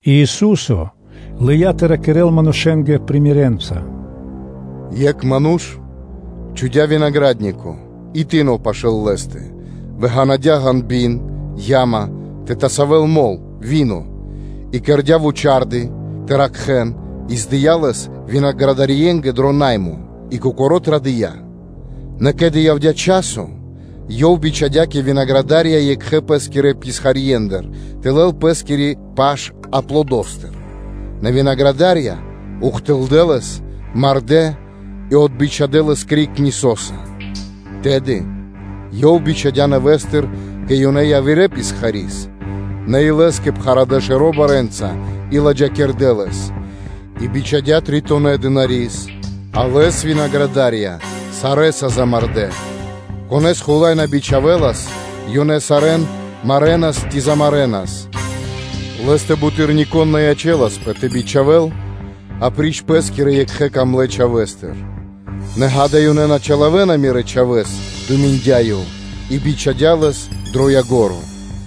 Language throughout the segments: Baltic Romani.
И Ису́со лыя́ тэ ракирэ́л манушэ́нгэ примерэнца (сыкаибнэнца): “Екх ману́ш чхудя́ винагра́днико, и тыно пашы́л лэ́стэ, вы ґанадя ґанби́н (яма) тэ тасавэл мол (вино) и кэрдя́ вучарды́ (вышка) тэ ракхэ́н, и здыя лэс винаградарьенгэ дро наймо и кокоро́ традыя́. Нэ ке́ли явдя́ часо, ёв бичхадя́ кэ винаградарья екхэ пэ́скирэ писхарьендыр тэ лэл пэ́скири паш аплодостыр, нэ винаградарья ухтылдэ́ лэс, мардэ́ и отбичхадэ лэс криг нисоса. Тэды ёв бичхадя́ нэвэ́стыр кэ ёнэ явирэ писхари́с, нэ и лэ́скэ пхарадэ шэро́ барэ́нца и ладжакирдэ́ лэс. И бичхадя́ тритонэ дынари́с; а лэс винаградарья сарэ́са замардэ́; конэ́с хула́й на бичхавэлас, ёнэ сарэ́н марэнас ци замарэнас. Лэ́стэ буты́р ни конэ́с на ячэласпэ тэ бичхавэл апри́ч пэ́скирэ екхэ дрогонэ́ чхавэ́стэ. “Нэ, ґа́да, ёнэ на чилавэна мирэ́ чхавэ́с”, – думиндя ёв и бичхадя́ лэс дро ко́нцо (дро яго́ро).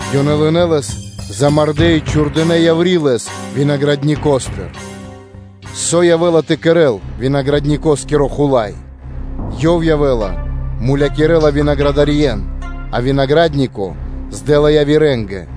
Ёнэ лынэ́ лэс, замардэ́ и чхурдынэ́ яври́ лэс винаградникостыр. Со явэ́ла тэ кэрэ́л винаградникоскиро хула́й? Ёв явэ́ла, мулякирэ́ла винаградарьен, а винагра́днико здэла явирэ́нгэ.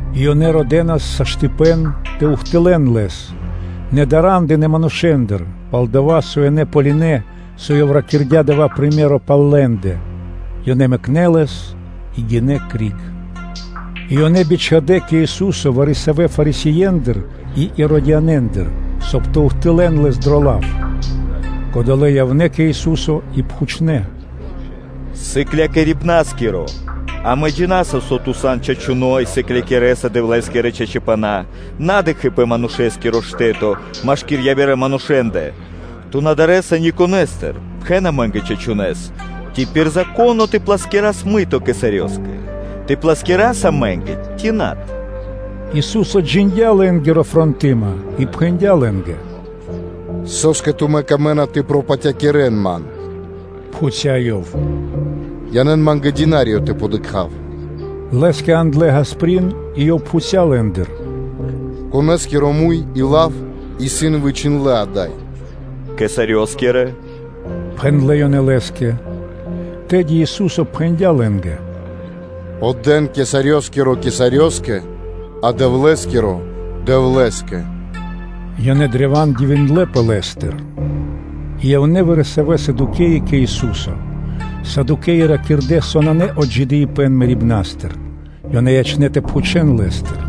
И ёнэ родэнас саштыпэн тэ ухтылэл Лэс, нэ дара́ндынэ манушэ́ндыр, пал-дова́ со ёнэ ґалынэ́, со Ёв ракирдя́ дава́ приме́ро (сыкаибэ́н) пал лэ́ндэ; ёнэ мэкнэ́ Лэс и гинэ́ криг. И ёнэ бичхадэ́ кэ Ису́со вари-савэ́ Фарисеендыр и Иродианэндыр, соб (кай) тэ ухтылэ́н Лэс дро лав. Кодолэ́ мануша́ явнэ́ кэ Ису́со и пхучнэ́: “Сыклякирибна́скиро! Амэ джина́са, со Ту сан чачуно́ и сыклякирэса Дэвлэ́скирэ чачипнэнгэ, на дыкхи́ пэ манушэ́скиро штэ́то машки́р явирэ манушэ́ндэ, Ту на дарэса никонэстыр; пхэн амэ́нгэ чачунэ́с: ци пир Зако́но тэ плэскирас мыто кесарёскэ? Тэ плэскирас амэ́нгэ ци над?” Ису́со джиндя́ лэ́нгири фротыма и пхэндя́ лэ́нгэ: “Со́скэ тумэ́ камэ́на тэ пропатякирэн Ман?” – пхуця́ Ёв. “Янэ́н Ма́нгэ динариё тэ дыкха́в.” Лэ́скэ яндлэ́ ґасприн (капейка) и Ёв пхуця́ лэ́ндыр: “Конэ́скиро муй и лав исын вычхиндлэ́ ада́й?” “Кесарёскиро”, – пхэндлэ́ ёнэ Лэ́скэ. Тэды Ису́со пхэндя́ лэ́нгэ: “Отдэ́н кесарёскиро кесарёскэ, а Дэвлэ́скиро Дэвлэ́скэ.” Ёнэ древа́н дивиндлэ́пэ Лэ́стыр. И явнэ́ вари-савэ́ Садукеи кэ Ису́со. Садукеи ракирдэ́, со нанэ отджидыипэн мэрибна́стыр. Ёнэ ячнэ́ тэ пхучэ́н Лэ́стыр: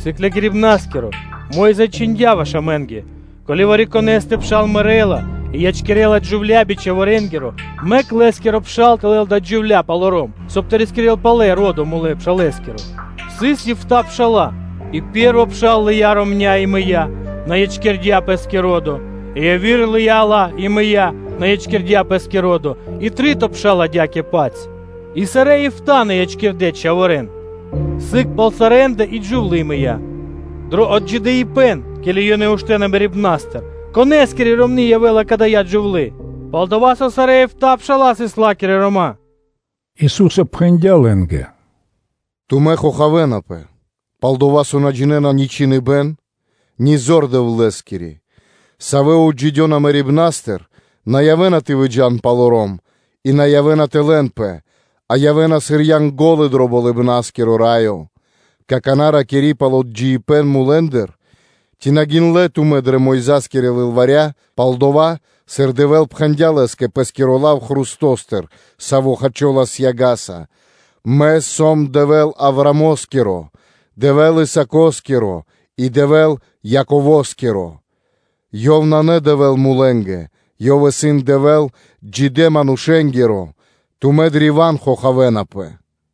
“Сыклякирибна́скиро! Мо́йза чхиндя́ ваш амэ́нгэ: ко́ли вари-конэ́стэ пшал мэрэ́ла и ячкирэ́ла джувля́ би чхаворэнгиро, мэк лэ́скиро пшал тэ лэл адаля джувля́ палоро́м, соб (кай) тэ рискирэ́л палэ ро́до мулэ́ пшалэскиро. Сыс эфта́ битринэ́нгиро дэш пша́ла; и пэ́рво пшал лыя́ ромня́, и мыя́, на ячкирдя́ пэ́скэ ро́до; и яви́р лыя́ ла и мыя́, на ячкирдя́ пэ́скэ ро́до: и три́то пшал адя́кэ-паць; и сарэ́ эфта́ на ячкирдэ́ чхаворэ́н. Сыг пал сарэ́ндэ и джувлы́ мыя́. Дро отджидыипэн, ке́ли ёнэ уштэна мэрибна́стыр, конэ́скири ромны́ явэ́ла кадая́ джувлы́? Пал-дова́ со сарэ́ эфта́ пша́ла сыс ла́кирэ рома́.” Ису́со пхэндя́ лэ́нгэ: “Тумэ́ хохавэнапэ, пал-дова́ со тумэ́ на джинэ́на ни Чхиныбэ́н, ни зор Дэвлэ́скири? Савэ отджидёна мэрибна́стыр, на явэ́на тэ выджа́н палоро́м; и на явэ́на тэ лэнпэ; а ёнэ явэ́на сыр Янго́лы дро Болыбна́скиро Раё. Какана́, ракири́ пал отджидыипэн мулэ́ндыр: ци на гиндлэ́ тумэ́ дрэ Мойза́скирэ лылваря пал дова́, сыр Дэвэ́л пхэндя́ Лэ́скэ Пэ́скиро лав хрустостыр, саво́ хачолас яга́са: ‘Мэ сом Дэвэ́л Авраамо́скиро, Дэвэ́л Исаакоскиро и Дэвэ́л Яково́скиро?’” Ёв исын Дэвэ́л на мулэнгэ, Ёв исын Дэвэ́л джидэ́-манушэ́нгиро! Тумэ́ древа́н хохавэнапэ.”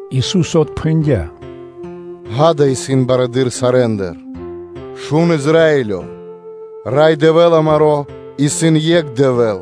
Ису́со отпхэндя́: “Ѓа́да, исын барэды́р сарэ́ндыр: ‘Шун Израилё! Рай Дэвэ́л амаро́ исын екх Дэвэ́л;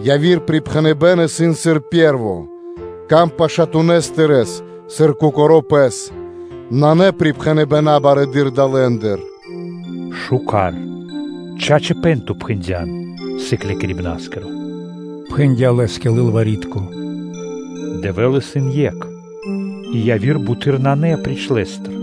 Яви́р припхэныбэ́н исын сыр пэ́рво: ‘Рикир дро ило́ пашатунэс тырэ́с, сыр кокоро́ пэс’. Нанэ припхэныбэна́ барэды́р далэндыр.” “Мишто́! Чачипэ́н Ту пхэндя́н, Сыклякирибна́скиро, – пхэндя́ Лэ́скэ лылвари́тко, – “Дэвэ́л исын Екх и яви́р буты́р нанэ апри́ч Лэ́стэ;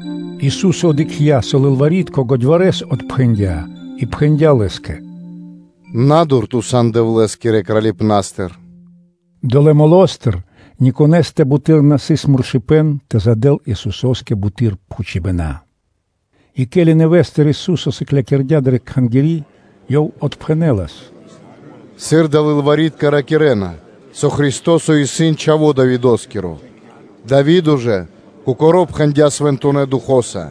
Ису́со дыкхця́, со лылвари́тко годьварэс отпхэндя́ и пхэндя́ Лэ́скэ: “Надур ту сан Дэвлэ́скирэ Кралипнастыр.” Долэ́ молостыр никонэстэ буты́р на сыс муршыпэн тэ задэл Исусо́скэ буты́р пхучибэна. И, ке́ли нэвэ́стыр Ису́со сыклякирдя́ дрэ Кхангири́, Ёв отпхэнэ́лас: “Сыр адалэ́ лылвари́тка ракирэ́на, со Христо́со исын Чхаво́ Давидо́скиро?” Дави́до жа Кокоро́ пхэндя́ Свэнтонэ́ Духо́са: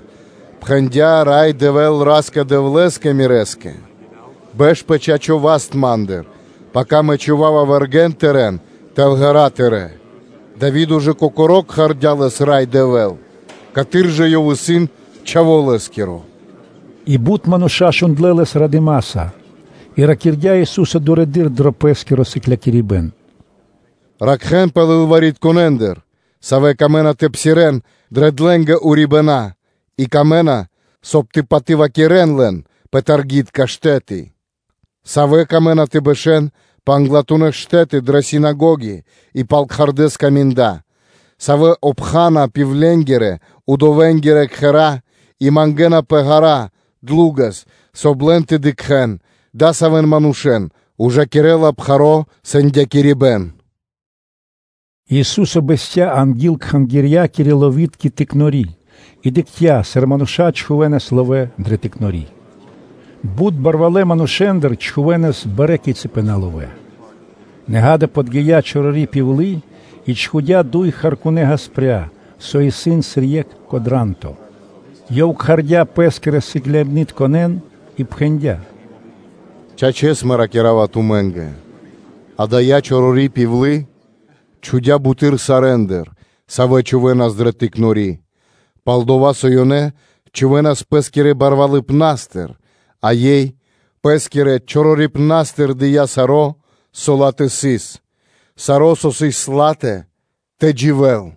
“Пхэндя Рай Дэвэ́л Ра́скэ-Дэвлэ́скэ мирэ́скэ: бэш пэ чачо́ (право) васт Ма́ндыр, пака Мэ чхува́ва вэргэ́н Тырэ́н тэл ґэра́ тырэ́.” Дави́до ж Кокоро́ кхардя́ Лэс “Рай Дэвэ́л”, каты́р жа Ёв исын Чхаво́ Лэ́скиро?” И бут мануша́ шундлэ́ Лэс радыма́са. И ракирдя́ Ису́со дурэды́р дро Пэ́скиро сыклякирибэ́н: “Ракхэ́нпэ лылваритконэндыр, савэ́нгэ пир ило́ тэ псирэ́н дрэ длэнгэ урибэна́ и лэ́нгэ трэй, соб (кай) тэ патывакирэн лэн пэ таргитка штэ́ты; савэ́ выкэдэна тэ бэшэ́н пэ англатунэ́ штэ́ты дрэ синагоги и пал кхардэ́ скаминда, савэ́ обхана пивленгирэ (удовэнгирэ) кхэра́ и мангэ́напэ ґара́ (длу́гэс), соб (кай) лэн тэ дыкхэ́н; адасавэн манушэ́н ужакирэ́ла пхаро́ сэндякирибэн.” И Ису́со бэсця́ анги́л Кхангирья́кирэ-ловитко пиралы́ (тыкнори) и дыкхця́, сыр мануша́ чхувэ́нас ловэ́ дрэ пиралы́. Бут барвалэ́ мануша́ чхувэ́нас барэ́ кицыпэна ловэ́. Нэ ґа́да, подги́я чорори пивлы (удова), и чхудя́ дуй харкунэ́ ґаспря (меди́тка гаспря), со исын сыр екх кодранто. Ёв кхардя́ Пэ́скирэ Сыкляибнытконэ́н и пхэндя́: “Чачэс, Мэ ракира́ва тумэ́нгэ: ада́я чорори пивлы чхудя́ буты́р сарэ́ндыр, савэ́ чхувэ́нас дрэ тыкнори, пал-дова́ со ёнэ чхувэ́нас пэ́скирэ балвалыпнастыр, а ёй пэ́скирэ чорорипнастыр дыя́ саро́, со ла́тэ сыс, саро́ со сыс ла́тэ тэ дживэ́л.”